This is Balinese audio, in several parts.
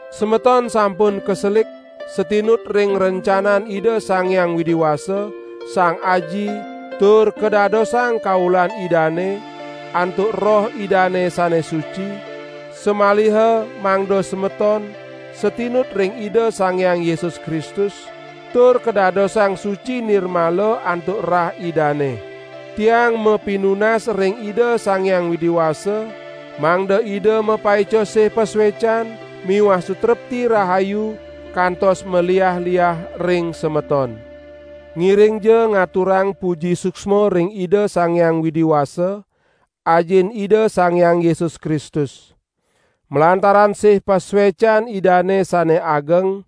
Semeton sampun kaselik satinut ring rencanan Ida Sang Hyang Widi Wasa, Sang Aji, tur kadadosang kaulan Idane antuk Roh Idane sane suci, samaliha mangda semeton satinut ring Ida Sang Hyang Yesus Kristus tur kadadosang suci nirmala antuk rah Idane. Tiang mapinunas ring Ida Sang Hyang Widi Wasa mangda Ida mapaica sih pasuecan miwah sutrepti rahayu kantos maliah-liah ring semeton. Ngiringja ngaturang puji suksma ring Ida Sang Hyang Widi Wasa, Ajin Ida Sang Hyang Yesus Kristus! Malantaran sih pasuecan Idane sane ageng,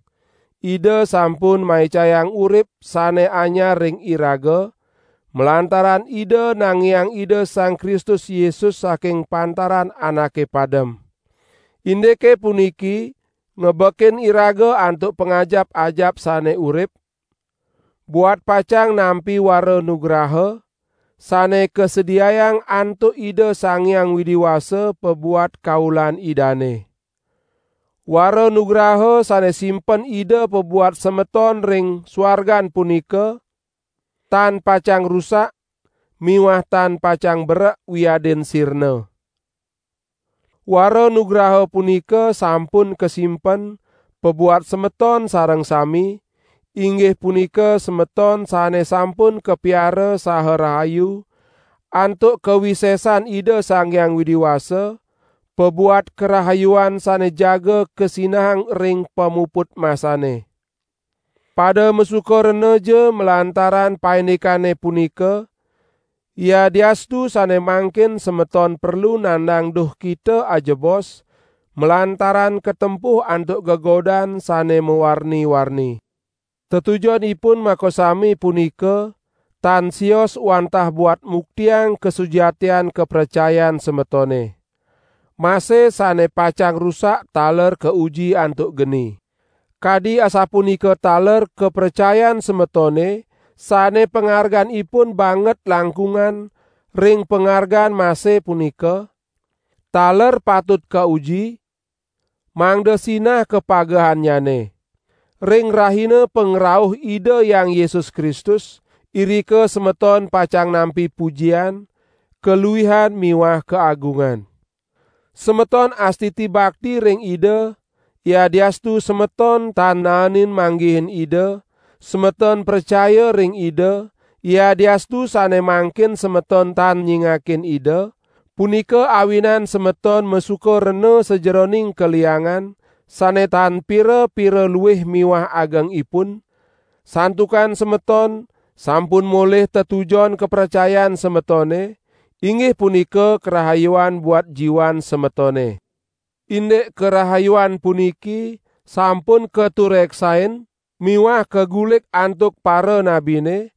Ida sampun maicayang urip sane anyar ring iraga, malantaran Ida nangiang Ida Sang Kristus Yesus saking pantaran anake padem. Indike puniki ngebekin iraga antuk pangajap-ajap sane urip, buat pacang nampi wara nugraha, sane kasediayang antuk Ida Sang Hyang Widi Wasa pabuat kaulan Idane. Wara nugraha sane simpen Ida pabuat semeton ring suargan punika, tan pacang rusak miwah tan pacang berek wiadin sirna. Wara nugraha punika sampun kasimpen pabuat semeton sareng sami, inggih punika semeton sane sampun kapiara saha rahayu antuk kawisesan Ida Sang Hyang Widi Wasa, pabuat karahayuan sane jaga kasinahang ring pamuput masane. Pada masuka renaja malantaran paindikane punika, yadiastu sane mangkin semeton perlu nandang duhkita ajebos malantaran katempuh antuk gegodan sane mawarni-warni. Tetujonipun makasami punika tan sios wantah buat muktiang kasujatian kapracayan semetone. Mase sane pacang rusak taler kauji antuk geni. Kadi asapunika taler kapracayan semetone sane pangarganipun banget langkungan ring pangargan mase punika, taler patut kauji, mangda sinah kapagehannyane. Ring rahina pangrauh Ida Hyang Yesus Kristus, irika semeton pacang nampi pujian, kaluihan miwah kaagungan. Semeton astiti bakti ring Ida, yadiastu semeton tan naenin manggihin Ida; semeton pracaya ring Ida, yadiastu sane mangkin semeton tan nyingakin Ida; punika awinan semeton masuka rena sajeroning kaliangan sane tan pira-pira luih miwah agengipun, santukan semeton sampun molih tetujon kapracayan semetone, inggih punika karahayuan buat jiwan semetone. Indik karahayuan puniki, sampun katureksain miwah kagulik antuk paranabine;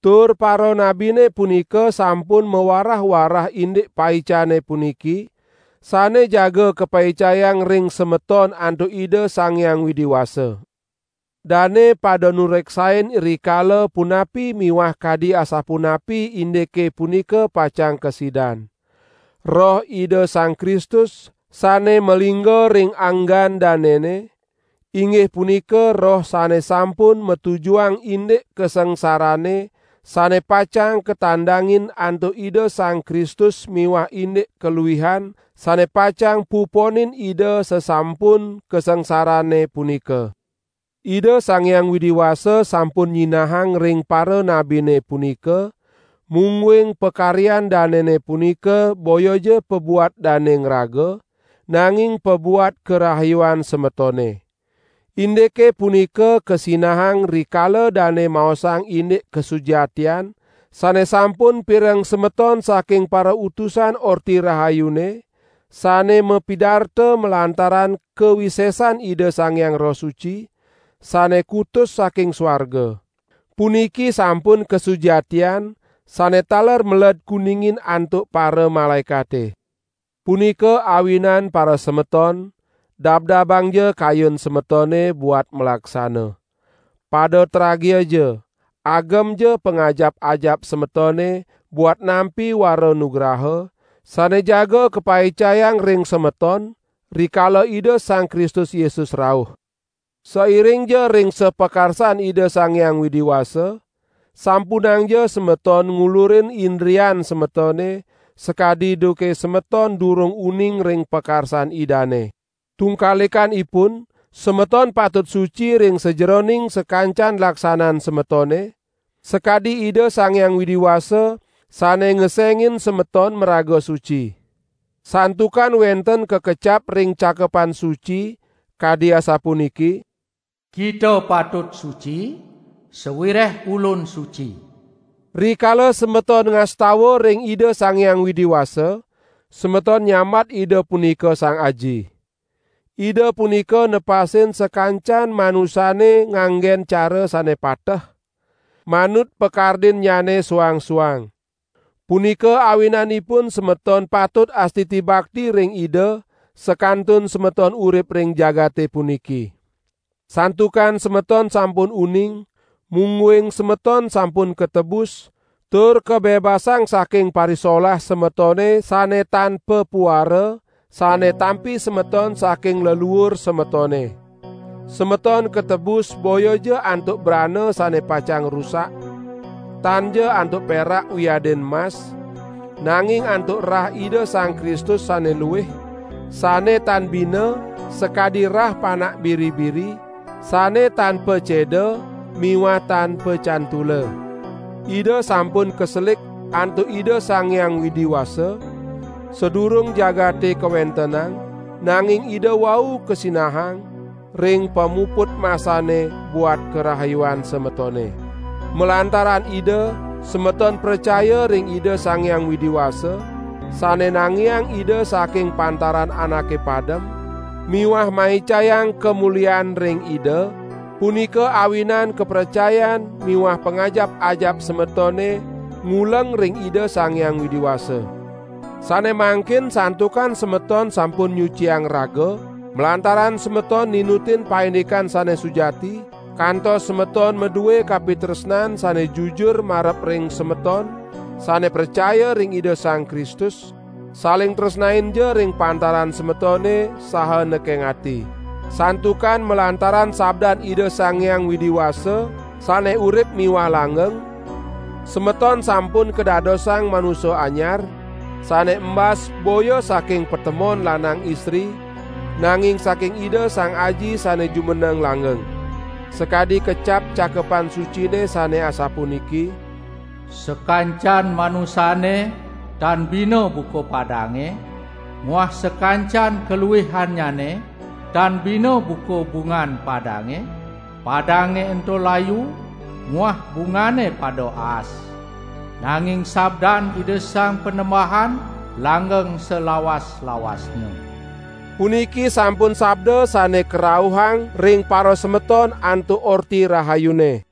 tur paranabine punika sampun mawarah-warah indik paicane puniki, sane jaga kapaicayang ring semeton antuk Ida Sang Hyang Widi Wasa. Dane pada nureksain rikala punapi miwah kadi asapunapi indike punika pacang kasidan. Roh Ida Sang Kristus sane malingga ring anggan danene, inggih punika Roh sane sampun matujuang indik kasangsarane sane pacang katandangin antuk Ida Sang Kristus miwah indik kaluihan sane pacang puponin Ida sasampun kasangsarane punika. Ida Sang Hyang Widi Wasa sampun nyinahang ring paranabine punika, mungguing pakaryan danene punika boyaja pabuat dane ngraga, nanging pabuat karahayuan semetone. Indike punika kasinahang rikala dane maosang indik kasujatian sane sampun pireng semeton saking parautusan Orti Rahayune, sane mapidarta malantaran kawisesan Ida Sang Hyang Roh Suci, sane kutus saking suarga. Puniki sampun kasujatian sane taler meled kuningin antuk paramalaekate. Punika awinan parasemeton, dabdabangja kayun semetone buat malaksana. Pada tragiaja, agemja pangajap-ajap semetone buat nampi wara nugraha sane jaga kapaicayang ring semeton, rikala Ida Sang Kristus Yesus rauh. Sairingja ring sapakarsan Ida Sang Hyang Widi Wasa, sampunangja semeton ngulurin indrian semetone sakadi duke semeton durung uning ring pakarsan Idane. Tungkalikanipun, semeton patut suci ring sajeroning sakancan laksanan semetone, sakadi Ida Sang Hyang Widi Wasa sane ngesengin semeton maraga suci. Santukan wenten kakecap ring Cakepan Suci kadi asapuniki: "Kita patut suci, sawireh Ulun suci." Rikala semeton ngastawa ring Ida Sang Hyang Widi Wasa, semeton nyambat Ida punika Sang Aji. Ida punika nepasin sakancan manusane nganggen cara sane pateh, manut pakardinnyane suang-suang. Punika awinanipun semeton patut astiti bakti ring Ida sakantun semeton urip ring jagate puniki. Santukan semeton sampun uning, mungguing semeton sampun katebus tur kabebasang saking parisolah semetone sane tan papuara sane tampi semeton saking leluur semetone. Semeton katebus boyaja antuk brana sane pacang rusak, tanja antuk perak wiadin mas, nanging antuk rah Ida Sang Kristus sane luih, sane tan bina sakadi rah panak biri-biri sane tan paceda miwah tan pacantula. Ida sampun kaselik antuk Ida Sang Hyang Widi Wasa, sadurung jagate kawentenang nanging Ida wau kasinahang ring pamuput masane buat karahayuan semetone. Malantaran Ida, semeton pracaya ring Ida Sang Hyang Widi Wasa, sane nangiang Ida saking pantaran anake padem miwah maicayang kamulian ring Ida; punika awinan kapracayan miwah pangajap-ajap semetone nguleng ring Ida Sang Hyang Widi Wasa. Sane mangkin santukan semeton sampun nyuciang raga, malantaran semeton ninutin paindikan sane sujati, kantos semeton madue kapitresnan sane jujur marep ring semeton sane pracaya ring Ida Sang Kristus, saling tresnainja ring pantaran semetone saha nekeng ati. Santukan malantaran sabdan Ida Sang Hyang Widi Wasa sane urip miwah langgeng, semeton sampun kadadosang manusa anyar, sane imbas boya saking patemon lanang istri, nanging saking Ida Sang Aji sane jumeneng langgeng. Sakadi kecap Cakepan Sucine sane asapuniki: "Sakancan manusane tan bina buka padange, muah sakancan kaluihannyane tan bina buka bungan padange; padange ento layu muah bungane pada aas, nanging Sabdan Ida Sang Panembahan langgeng salawas-lawasnya." Puniki sampun sabda sane karauhang ring parasemeton antuk Orti Rahayune.